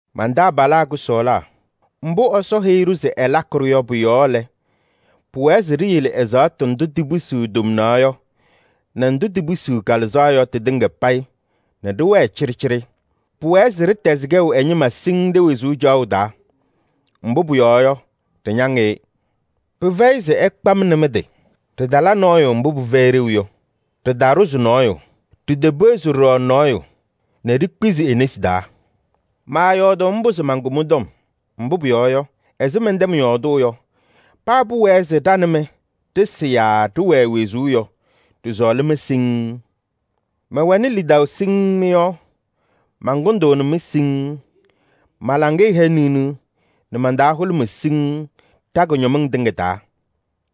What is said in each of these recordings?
Man-taabalaa kʋsɔɔlaa, mbʋ Ɛsɔ heyi-ɖʋ se ɛlakɩ-ɖʋ yɔ pʋ-yɔɔ lɛ, pɩwɛɛ se ɖiyele ɛzaɣtʋ ndʋ tipisiɣ tomnaɣ yɔ nɛ ndʋ tipisiɣ kalɩzaɣ yɔ tɩtɩŋa payɩ nɛ ɖɩwɛɛ cɩɖɩcɩɖɩ. Pʋwɛɛ se ɖɩtɛzɩ kɛʋ ɛ-ñɩma siŋŋ ɖe-wezuu caɣʋ taa. Mbʋ pʋyɔɔ yɔ, ɖɩñaŋ-ɩ. Pɩfɛyɩ se ɩkpa-m nɛ mɩ-tɩ. Ɖɩtala nɔɔyʋ mbʋ pɩfɛyɩ ɖeu yɔ. Ɖɩtaɖʋzɩ nɔɔyʋ, ɖitepeɣzi ɖɔɖɔ nɔɔyʋ nɛ ɖikpizi e-nesi taa. Maayɔɔdʋʋ mbʋ se mankʋ mɩ-tɔm. Mbʋ pʋyɔɔ yɔ, ɛzɩ mɛntɛm yɔɔdʋʋ yɔ, paa pʋwɛɛ se ɖa nɛ mɩ ɖɩsɩ yaa ɖɩwɛɛ wezuu yɔ, ɖɩsɔɔlɩ-mɩ siŋŋ. Mɛwɛnɩ lidaʋ siŋŋ mɩ-yɔɔ, mankʋndʋʋnɩ-mɩ siŋŋ. Ma-laŋɩyɛ hɛ niɣniɣ nɛ man-taa hʋlʋmɩ siŋŋ ɖa-kʋñɔmɩŋ tɩŋa taa.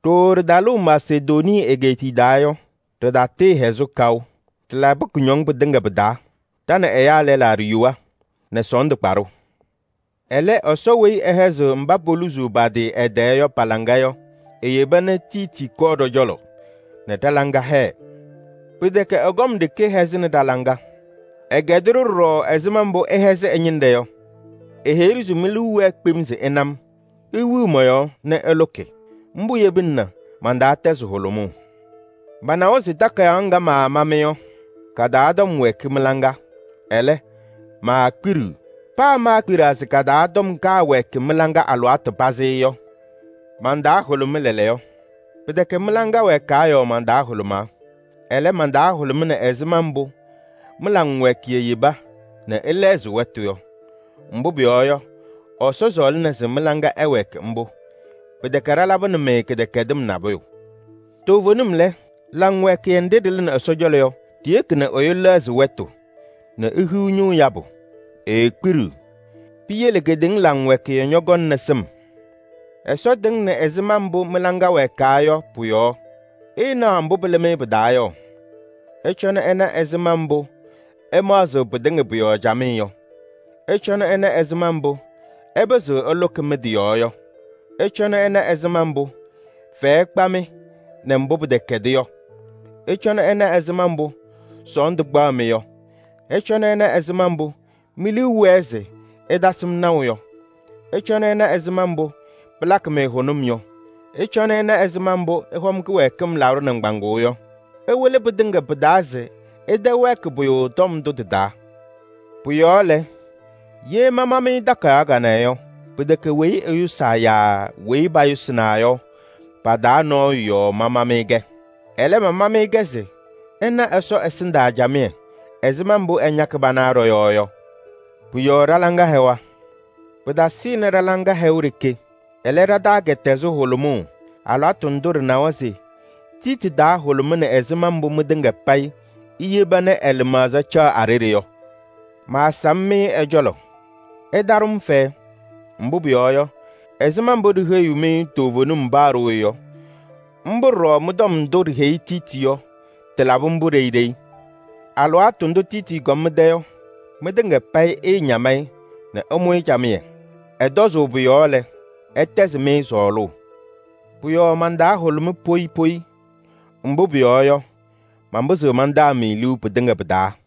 Ɖooo ɖɩtalʋʋ Masedonii egeetiye taa yɔ, ɖɩtatɩɩhɛzɩ kaʋ. Ɖɩlabɩ kʋñɔŋ pɩtɩŋa pɩ-taa: ɖa nɛ ɛyaa lɛlaa ɖiyowa nɛ sɔɔndʋ kpa-ɖʋ. Ɛlɛ, Ɛsɔ weyi ɛhɛzɩɣ mba poluzuu pa-tɩ ɛ-tɛɛ yɔ pa-laŋa yɔ, eyeba nɛ Tiiti kɔɔ ɖɔ-cɔlɔ nɛ ɖa-laŋa hɛɛ. Pɩtɛkɛ ɛ-kɔm ɖeke hɛzɩnɩ ɖa-laŋa. Ɛkɛdɩ-ɖʋ ɖɔɖɔ ɛzɩma mbʋ ɩhɛzɩ ɛ-ñɩnɖɛ yɔ. Eheyi-ɖʋ se mi-liu wɛɛ kpem se ɩna-m, iwiɣ mɔ-yɔɔ nɛ ɩlʋkɩ. Mbʋ yebina nɛ man-taa tɛzɩ hʋlʋmʋʋ. Manawa se takayaɣ ŋga maama-mɩ yɔ, ka-taa tɔm wɛɛkɩ mɩ-laŋa, ɛlɛ, maakpiɖiɣ. Paa maakpiɖaa se ka-taa tɔm kaawɛɛkɩ mɩ-laŋa alɩwaatʋ pazɩ yɔ, man-taa hʋlʋmɩ lɛɛlɛɛyɔ. Pɩtɛkɛ mɩ-laŋa wɛɛkaa yɔɔ man-taa hʋlʋmaa. Ɛlɛ, man-taa hʋlʋmɩnɩ ɛzɩma mbʋ mɩ-laŋwɛɛkɩyɛ yeba nɛ ɩlɛɣzɩ wɛtʋ yɔ. Mbʋ pʋyɔɔ yɔ, Ɛsɔ sɔɔlɩna se mɩ-laŋa ɛwɛɛkɩ mbʋ. Pɩtɛkɛ ɖalabɩnɩ-mɩ kɩdɛkɛdɩm nabʋyʋ. Toovenim lɛ, laŋwɛɛkɩyɛ nɖɩ ɖɩlɩnɩ Ɛsɔ cɔlɔ yɔ, ɖiyeki nɛ ɛyʋ lɛɣzɩ wɛtʋ nɛ ehiɣ ñʋʋ yabʋ, eekpiɖiɣ. Piyele kedeŋa laŋwɛɛkɩyɛ ñɔkɔŋnɩ sɩm. Ɛsɔ tɩŋnɩ ɛzɩma mbʋ mɩ-laŋa wɛɛkaa yɔ pʋ-yɔɔ, ɩɩnaɣ mbʋ pɩlɩ-mɩ pɩ-taa yɔ: ɩcɔnɩ ɩna ɛzɩma mbʋ ɩmaɣzɩɣ pɩtɩŋa pʋ-yɔɔ camɩyɛ yɔ! Ɩcɔnɩ ɩna ɛzɩma mbʋ ɩpɩzɩɣ ɩlʋkɩ mɩ-tɩ yɔɔ yɔ! Ɩcɔnɩ ɩna ɛzɩma mbʋ fɛyɛ kpaɣ-mɩ nɛ mbʋ pɩtɛkɛdɩ yɔ! Ɩcɔnɩ ɩna ɛzɩma mbʋ sɔɔndʋ kpaɣ-mɩ yɔ! Ɩcɔnɩ ɩna ɛzɩma mbʋ mi-liu wɛɛ se ɩtasɩ-m naʋ yɔ! Ɩcɔnɩ ɩna ɛzɩma mbʋ pɩlakɩ-mɩ hʋnʋm yɔ! Ɩcɔnɩ ɩna ɛzɩma mbʋ ɩhɔm kɩwɛɛkɩm laɖʋ nɩŋgbaŋʋʋ yɔ! Ɩwɩlɩ pɩtɩŋa pɩ-taa se ɩtɛwɛɛkɩ pʋyʋ tɔm ndʋ tɩ-taa. Pʋ-yɔɔ lɛ, ye mama-mɩ takayaɣ kanɛ yɔ, pɩtɛkɛ weyi ɛyʋsaa yaa weyi payʋsɩnaa yɔ, pa-taa nɔɔyʋ yɔɔ mama-mɩ-kɛ. Ɛlɛ, mama-mɩ-kɛ se ɩna Ɛsɔ ɛsɩndaa camɩyɛ ɛzɩma mbʋ ɩñakɩ pana ɖɔ-yɔɔ yɔ. Pʋ-yɔɔ ɖa-laŋa hɛwa. Pɩtasɩnɩ ɖa-laŋa hɛʋ ɖeke. Ɛlɛ, ɖa-taa kɛtɛzɩ hʋlʋmʋʋ alɩwaatʋ ndʋ ɖɩnawa se Tiiti taa hʋlʋmɩnɩ ɛzɩma mbʋ mɩtɩŋa payɩ iyeba nɛ ɛ-lɩmaɣza caɣ a-ɖeɖe yɔ. Maasam-mɩ ɛ-cɔlɔ, ɩtaɖʋ-m fɛyɛ. Mbʋ pʋyɔɔ yɔ, ɛzɩma mbʋ ɖiheyiɣ-mɩ toovenim paa ɖooye yɔ, mbʋ ɖɔɖɔ mɩ-tɔm ndʋ ɖiheyi Tiiti yɔ, tɩlabɩ mbʋ ɖeyi ɖeyi. Alɩwaatʋ ndʋ Tiiti kɔm mɩ-tɛ yɔ, mɩtɩŋa payɩ ɩɩñam-ɩ nɛ ɩmʋ-ɩ camɩyɛ. Ɛtɔzʋʋ pʋ-yɔɔ lɛ, ɛtɛzɩɣ-mɩ sɔɔlʋʋ. Pʋ-yɔɔ man-taa hʋlʋmɩ poyi poyi, mbʋ pʋyɔɔ yɔ, manpɩzɩɣ mantaa-mɩ liu pɩtɩŋa pɩ-taa.